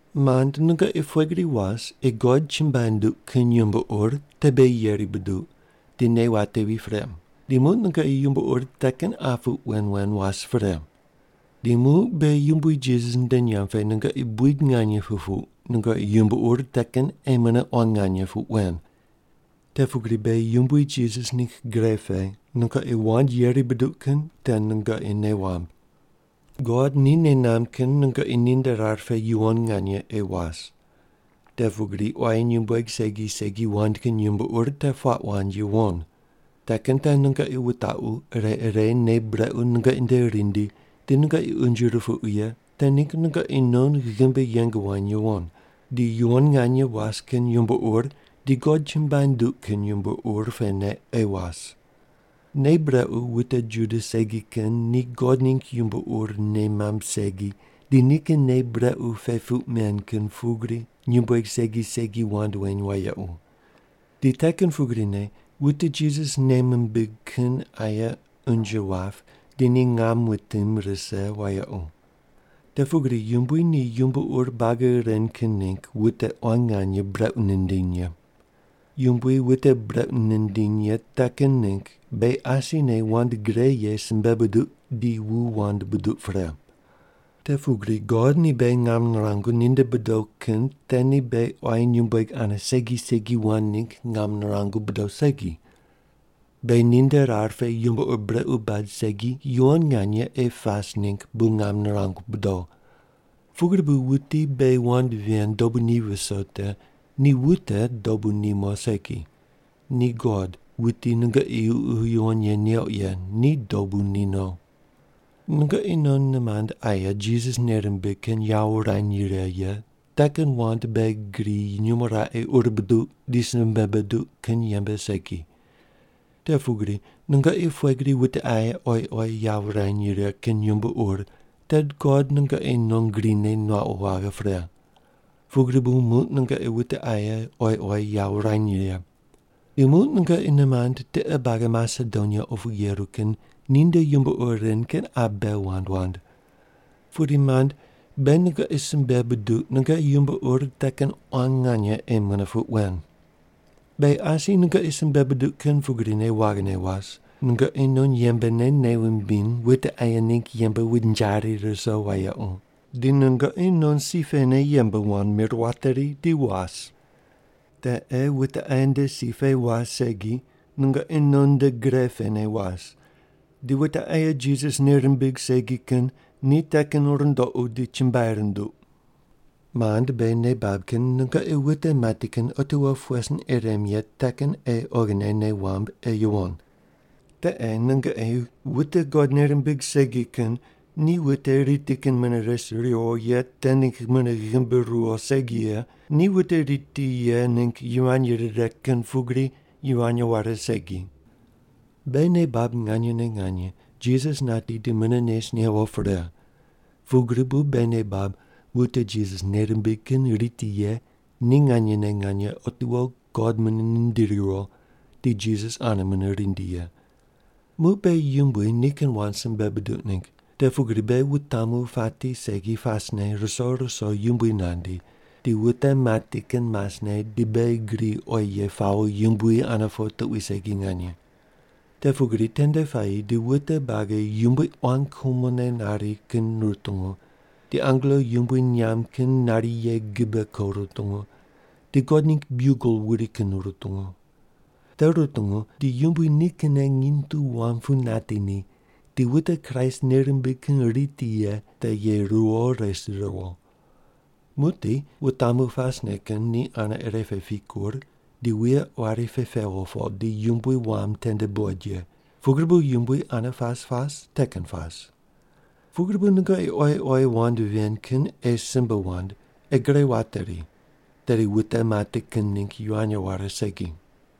Mand, nungoqi pughe gri was ei God chumbuai nunduq kin yumbo ur te beghi yeri buduq di nei watevi pre, di muq nungoqi yumbo ur te kin qa puq wen wen was pre. Di muq beghi Yumbui Jisas nde nyamb pe nungoqi buid nganye pupuq nungoqi yumbo ur te kin ei mune quan nganye puq wen. Te pugri beghi Yumbui Jisas ningg gre pe nungoqi wand yeri buduq kin te nungoqi nei wamb. God ni nei namb kin nungoqi ninde rar pe yuwon nganye ei was: Te pugri quayi nyumbueg segi segi wand kin yumbo ur te puaq wand yuwon. Te kin te nungoqi wutaqu ire ire nei brequ nungoqi nde rindi di nungoqi unje rupuqu ye te ningg nungoqi non ghimbi yeng wany yuwon, di yuwon nganye was kin yumbo ur di God chumbuai nunduq kin yumbo ur pene ei was. Nei brequ wute Juda segi kin ni God ningg yumbo ur nei mamb segi di nikin nei brequ pe puq men kin pugri nyumbueg segi segi wand weny wayequ. Di te kin pugrine wute Jisas nei mimbig kin aye unje wap di ni ngam wutim rise wayequ. Te pugri Yumbui ni yumbo ur buagi ren kin ningg wute quan nganye brequ nindiny ye. Yumbui wute brequ nindiny ye te kin ningg beghi asine wand gre ye simbe buduq di wu wand buduq pre. Te pugri God ni beghi ngam nirangu ninde bodo kin te ni beghi quayi nyumbueg ane segi segi wand ningg ngam nirangu bodo segi, beghi ninde rar pe yumbo ur brequ bad segi yuwon nganye ei pas ningg bu ngam nirangu bodo. Pugri bu wuti beghi wand ven dobu ni viso te ni wute dobu ni mo segi, ni God wuti nungoqi Ququ Yuwon Ye neuq ye ni dobu ni no. Nungoqi non nimand aye Jisas nei rimbig kin yawo wurany righe ye te kin wand beghi gri nyumo raqe ur buduq di simbe buduq kin yembe segi. Te pugri nungoqi pughe gri wute aye oyi oyi yawo wurany righe kin yumbo ur te God nungoqi non grine nuaqu waghe pre. Pugri bu muq nungoqi wute aye oyi oyi yawo wurany righe. Di muq nungoqi nimand tiqe buagi Masedonia opu yeru kin ninde yumbo ur ren kin qa bei wand wand. Pudi mand, beghi nungoqi simbe buduq nungoqi yumbo ur te kin quan nganye ei mune puq wen. Beghi asi nungoqi simbe buduq kin pugrine waghine was, nungoqi non yembene nei wumbiny wute aye ningg yembe wunjari ruso wayequ, di nungoqi non si pene yembe wand mir wateri di was. Te ei wute aye nde si pe was segi nungoqi non nde gre pene was, di wute aye Jisas nei rimbig segi kin ni te kin rundoqu di chumbuai runduq. Mand, beghi nei bab kin nungoqi wute mati kin otiwo pughe sin ei rem ye te kin ei oghine nei wamb ei yuwon. Te ei nungoqi wute God nei rimbig segi kin ni wute riti kin mune res riwo ye te ningg mune ghimbi ruwo segi ye ni wute riti ye ningg yivany rire kin pugri yivany ware segi. Beghi nei bab nganyene nganye Jisas nati di mune nes newo pre, pugri bu beghi nei bab wute Jisas nei rimbig kin riti ye ni nganyene nganye otiwo God mune nindiri riwo di Jisas ane mune rindi ye. Muq beghi Yumbui nikin wand simbe buduq ningg, te pugri beghi wutamu pati segi pasne ruso ruso Yumbui nandi, di wute mati kin masne di beghi gri oyi ye pawo Yumbui ane po tuqui segi nganye. Te pugri tende puayi di wute buagi Yumbui quan kumone nari kin rutungu, di angelo yumbui nyamb kin nari ye gibe ko rutungu, di God ningg biugel wuri kin rutungu. Te rutungu di Yumbui nikinne nginy tu wam pu nati ni di wute Kraist nei rimbig kin riti ye te ye ruwo res riwo. Muqdi wutamu pasne kin ni ane ire pe pikur di wuye quari pe pewo po di Yumbui wam tende buqoid ye, pugri bu Yumbui ane pas pas te kin pas. Pugri bu nungoqi oyi oyi wand ven kin ei simbe wand ei gre wateri tedi wute mati kin ningg yivany ware segi.